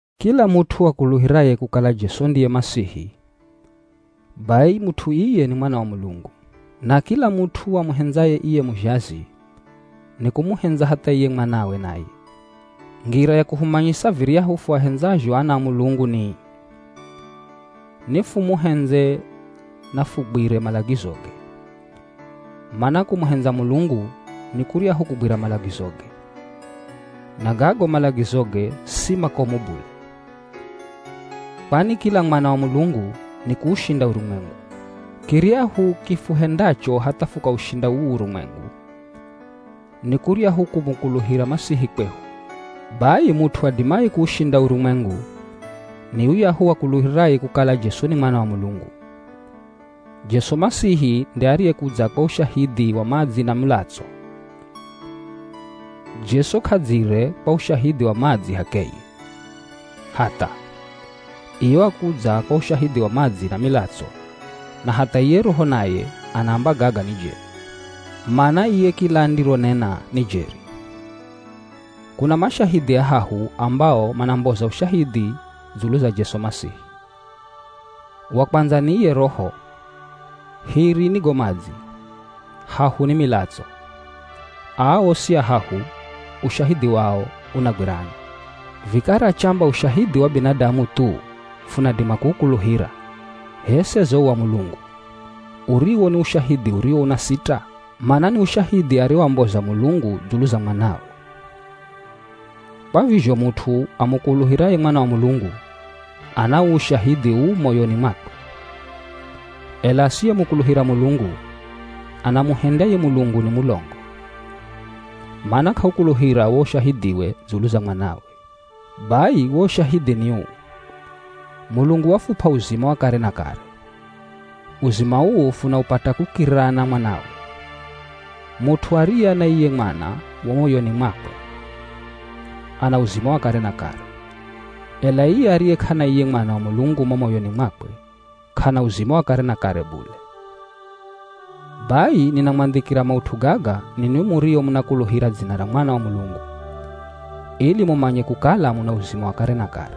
Kila mut'u akuluhiraye kukala Jesu ndiye Masihi, bai mut'u iye ni mwana wa Mulungu, na kila mut'u amuhendzaye iye muzhazi, ni kumuhendza hatha iye mwanawe naye. Ngira ya kuhumanyisa viryahu fuahendzazho ana a Mulungu ni ii: Nifumuhendze na fugwire malagizoge. Mana kumuhendza Mulungu, ni kuryahu kugwira malagizoge. Na gago malagizoge si makomu bule. Kwani kila mwana wa Mulungu, nikuushinda urumwengu. Kiryahu kifuhendacho hatha fukaushinda uu urumwengu, ni kuryahu kumukuluhira Masihi kwehu. Bai mut'u adimaye kuushinda urumwengu, ni yuyahu akuluhiraye kukala Jesu ni Mwana wa Mulungu. Jesu Masihi nde ariyekudza kwa ushahidhi wa madzi na mulatso. Jesu k'adzire kwa ushahidhi wa madzi h'akeye, hatha, iye wakudza kwa ushahidhi wa madzi na milatso. Na hatha iye Roho naye anaamba gaga ni jeri, mana iye kila andironena ni jeri. Kuna mashahidhi ahahu ambao manamboza ushahidhi dzulu za Jesu Masihi. Wa kwandza, ni iye Roho, hiri ni go madzi, hahu ni milatso. Aa osi ahahu, ushahidhi wao unagwirana. Vikara chamba ushahidhi wa binadamu thu, funadima kuukuluhira, h'e seze wo wa Mulungu, uriwo ni ushahidhi uriwo unasita? Mana ni ushahidhi ariowamboza Mulungu dzulu za Mwanawe. Kwa vizho mut'u amukuluhiraye Mwana wa Mulungu, ana uu ushahidhi uu mo moyoni mwakwe, ela asiyemukuluhira Mulungu, anamuhendya ye Mulungu ni mulongo, mana k'aukuluhira wo ushahidhiwe dzulu za Mwanawe. Bai wo ushahidhi ni uu: Mulungu wafup'a uzima wa kare na kare. Uzima uu funaupata kukirirana Mwanawe. Mut'u ariye ana iye Mwana mo moyoni mwakwe, ana uzima wa kare na kare, ela iye ariye k'ana iye Mwana wa Mulungu mo moyoni mwakwe, k'ana uzima wa kare na kare bule. Bai ninamwandhikira maut'u gaga ninwi murio munakuluhira dzina ra Mwana wa Mulungu, ili mumanye kukala muna uzima wa kare na kare.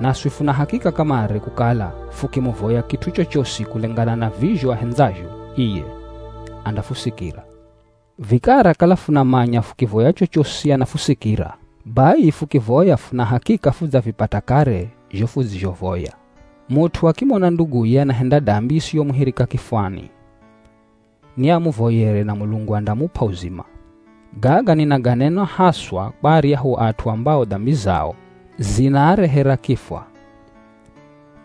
Naswi funa hakika kamare kukala fukimuvoya kit'u chochosi kulengana na vizho ahendzazho iye, andafusikira. Vikara kala funamanya fukivoya chochosi anafusikira, bai fukivoya funa hakika fudzavipata kare zho fudzizhovoya. Mut'u akimona nduguye anahenda dambi isiyomuhirika kifwani, ni amuvoyere na Mulungu andamup'a uzima. Gaga ninaganena haswa kwa aryahu at'u ambao dambi zao zinaarehera kifwa.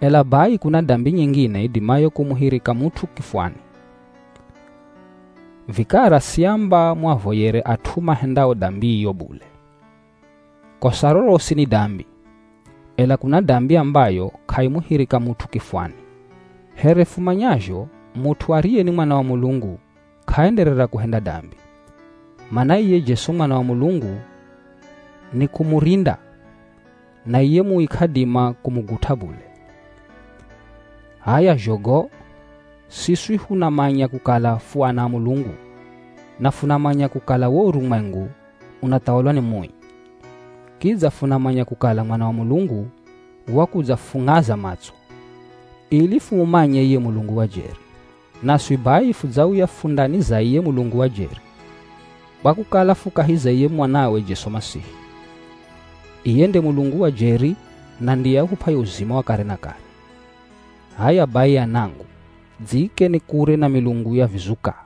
Ela bai kuna dambi nyingine idimayo kumuhirika mut'u kifwani, vikara siamba muavoyere at'u mahendao dambi iyo bule. Kosa rorosi ni dambi, ela kuna dambi ambayo k'aimuhirika mut'u kifwani. Here fumanyazho mut'u ariye ni mwana wa Mulungu, k'aenderera kuhenda dambi, mana iye Jesu Mwana wa Mulungu ni kumurinda, na iye Mui k'adima kumugut'a bule. H'aya zho go, siswi funamanya kukala fu ana a Mulungu na funamanya kukala wo urumwengu unathawalwa ni Mui. Kidza funamanya kukala Mwana wa Mulungu wakudzafung'aza matso, ili fumumanye iye Mulungu wa jeri. Naswi bai fudzauya fu ndani za iye Mulungu wa jeri, kwa kukala fu kahi za iye Mwanawe Jesu Masihi. Iye nde Mulungu wa jeri na ndiye ahup'aye uzima wa kare na kare. H'aya bai anangu, dziikeni kure na milungu ya vizuka.